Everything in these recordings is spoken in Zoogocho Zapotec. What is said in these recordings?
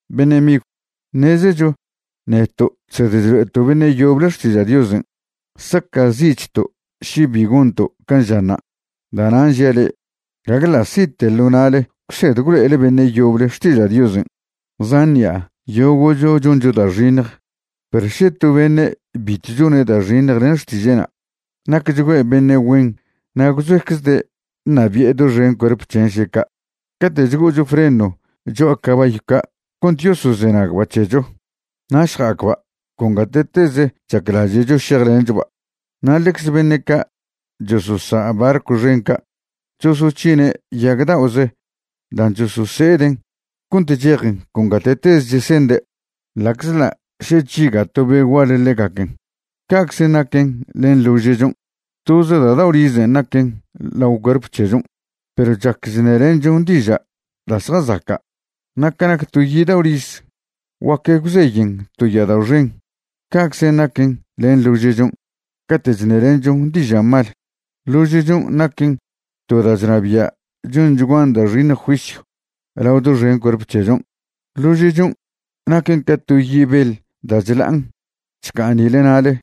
Beṉe' migw, ṉezecho neto' chsed chlo'eto' beṉe' yoble xtiža' Diosen' saca'zi'chto' še bi gonto' can' žanṉa'. Da'nan' žia' le'e, gague ḻa' si'te ḻo na'le gwsed gwlo'ele beṉe' yoble xtiža' Diosen'. Zan ṉi'a yogo'cho choncho da' xiṉj. Perw še to beṉe' bitw chone' da' xiṉj len xtiže'na', nacchgüe' beṉe' güen na' gwzoeczde' ṉabie' doxen cuerp c̱hen' še ca'. Caten' chgo'ocho freno cho'a cabayw ca' cont yosozenagba' c̱hecho, na' šja'acba' con gate'teze chaclaže'cho šejlenchoba'. Na' ḻecze beṉe' ca' chososa' barcw xen ca' chosoc̱hine' yag da'oze dan' chosose'eden' cont chejen con gate'teze chesende', ḻa'czḻa' še chžiga' to be' gual ḻegaquen'. Ca'czen' naquen len ḻože'chon'. Toze da' dao' rizen' naquen lao cuerp c̱hechon', perw chac chṉelenchon diža' da' zjazaca'. Na' ca nac to yi' dao' riz, guac gwzeyen to ya'adao' xen, ca'czen' naquen len ḻože'chon' cate' chṉelenchon diža' mal. Ḻože'chon' naquen to da' chnabia' chonchguan da' xiṉj juisyw lao doxen cuerp c̱hechon'. Ḻože'chon' naquen ca to yi' beḻ da' chla'an chca'an nile na'le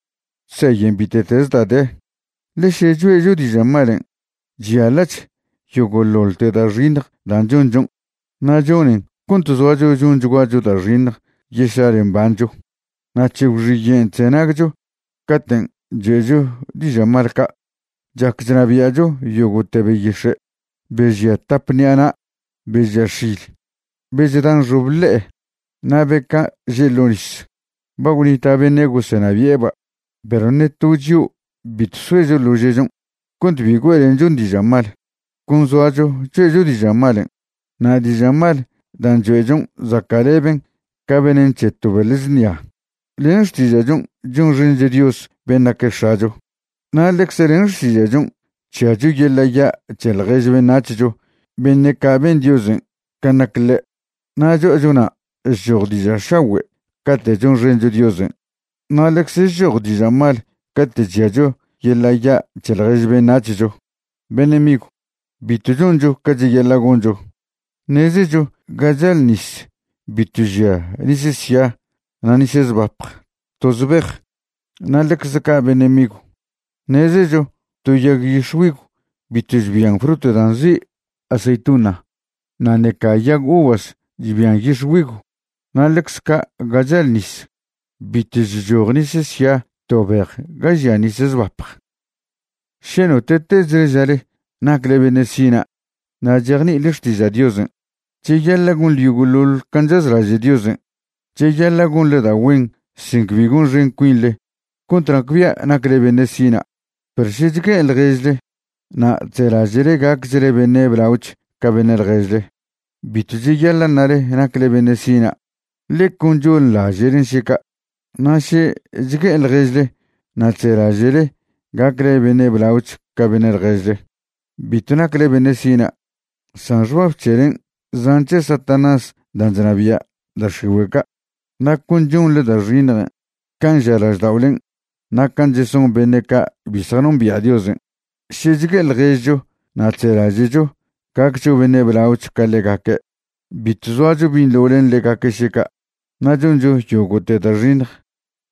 chzeyen bite'teze da' de, ḻe še choe'cho diža' malen' chyaḻa'ch yogo'ḻoḻte da' xiṉj dan' chonchon', na' chonen cont zoacho chonchguacho da' xiṉj yešlale mbancho. Na' c̱he gwxiyen' chzenagcho caten' choe'cho diža' mal ca'. Chac chnabia'cho yogo'te beyix̱e', be žia tap ṉi'a na', be žia x̱il, be chda nxobe ḻe'e, na' be ca' že' ḻo' nis. Ba gwnita' beṉe' gosenabi'eba'. Perw ṉe to chio' bitw soecho ḻože'chon' cont bi güe'lenchon diža' mal. Con zoacho choe'cho diža' malen', na' diža' mal dan' choe'chon' zaca'leben ca venen c̱he to beḻ znia. Len xtiža'chon' chonxencho Dios ben' naque' X̱acho. Na' ḻecze len xtiža'chon' chžiacho yeḻa' ya' c̱he ḻjež beṉac̱hcho beṉe' ca' ben Diosen' can' nac ḻe'. Na' cho'acho na' chchoj diža' šagüe' cate' chonxencho Diosen' na' ḻecze chchoj diža' mal cate' chžiacho yeḻa' ya' c̱he ḻjež beṉac̱hcho. Beṉe' migw, bitw choncho ca cheyaḻa' goncho. Ṉezecho ga chal nis bitw žia nis sia na' nis zbapj toz bej. Na' ḻecze ca' beṉe' migw, ṉezecho to yag yix̱güigw bitw chbian frut dan' nzi' aceituna, na' ṉeca yag uvas chbian yix̱güigw. Na' ḻecze ca' ga chal nis, bitw chchoj nis sia to bej ga žia nis zbapj. Še note'tezle žale nacle beṉe' sina' na' chejni'ile xtiža' Diosen', cheyaḻa' gonḻe yogo'ḻoḻ can' chazlaže' Diosen'. Cheyaḻa' gonḻe da' güen sin cbi gonxen cuinḻe cont nacbia' nacle beṉe' sina'. Perw še chgue'e ḻježle na' chzelaže'le gacchle beṉe' blaoch ca beṉe' ḻježle, bitw cheyaḻa' ṉale nacle beṉe' sina', ḻe con chonḻaže'len' še ca'. Na' še chgue'e ḻježle na' chzelaže'le gacle beṉe' blaoch ca beṉe' ḻježle, bitw nacle beṉe' sina', san xbab c̱helen' zan' c̱he Satanás dan' chnabia' da' x̱igüe' ca', na' con chonḻe da' xiṉjen' can' ža lažda'olen' na' can' cheson beṉe' ca' bi zjanombia' Diosen'. Še chgue'e ḻježcho na' chzelaže'cho gaccho beṉe' blaoch ca ḻegaque', bitw zoacho binḻo len ḻegaque' še ca', na' choncho yogo'te da' xiṉj.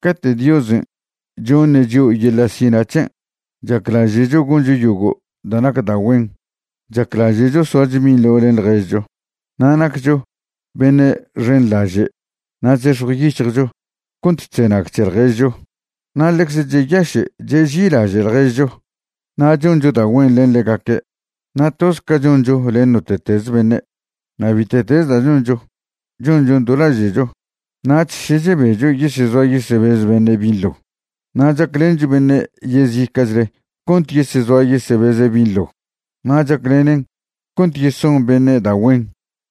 Cate' Diosen' choṉe' chio' yeḻa' sina' c̱hen', chaclaže'cho goncho yogo' da' nac da' güen. Chaclaže'cho soacho binḻo len ḻježcho na' naccho beṉe' xenḻaže' na' chzex̱jw yic̱hjcho cont chzenag c̱he ḻježcho. Na' ḻecze cheyaše' cheži'ilaže' ḻježcho na' choncho da' güen len ḻegaque', na' toz ca choncho len note'tez beṉe'. Na' bite'tez da' choncho, chonchon do laže'cho. Nach še chebecho yesezoa yesebez beṉe' binḻo na' chaclencho beṉe' yezica'chle cont yesezoa yesebeze' binḻo, na' chaclenen cont yeson beṉe' da' güen.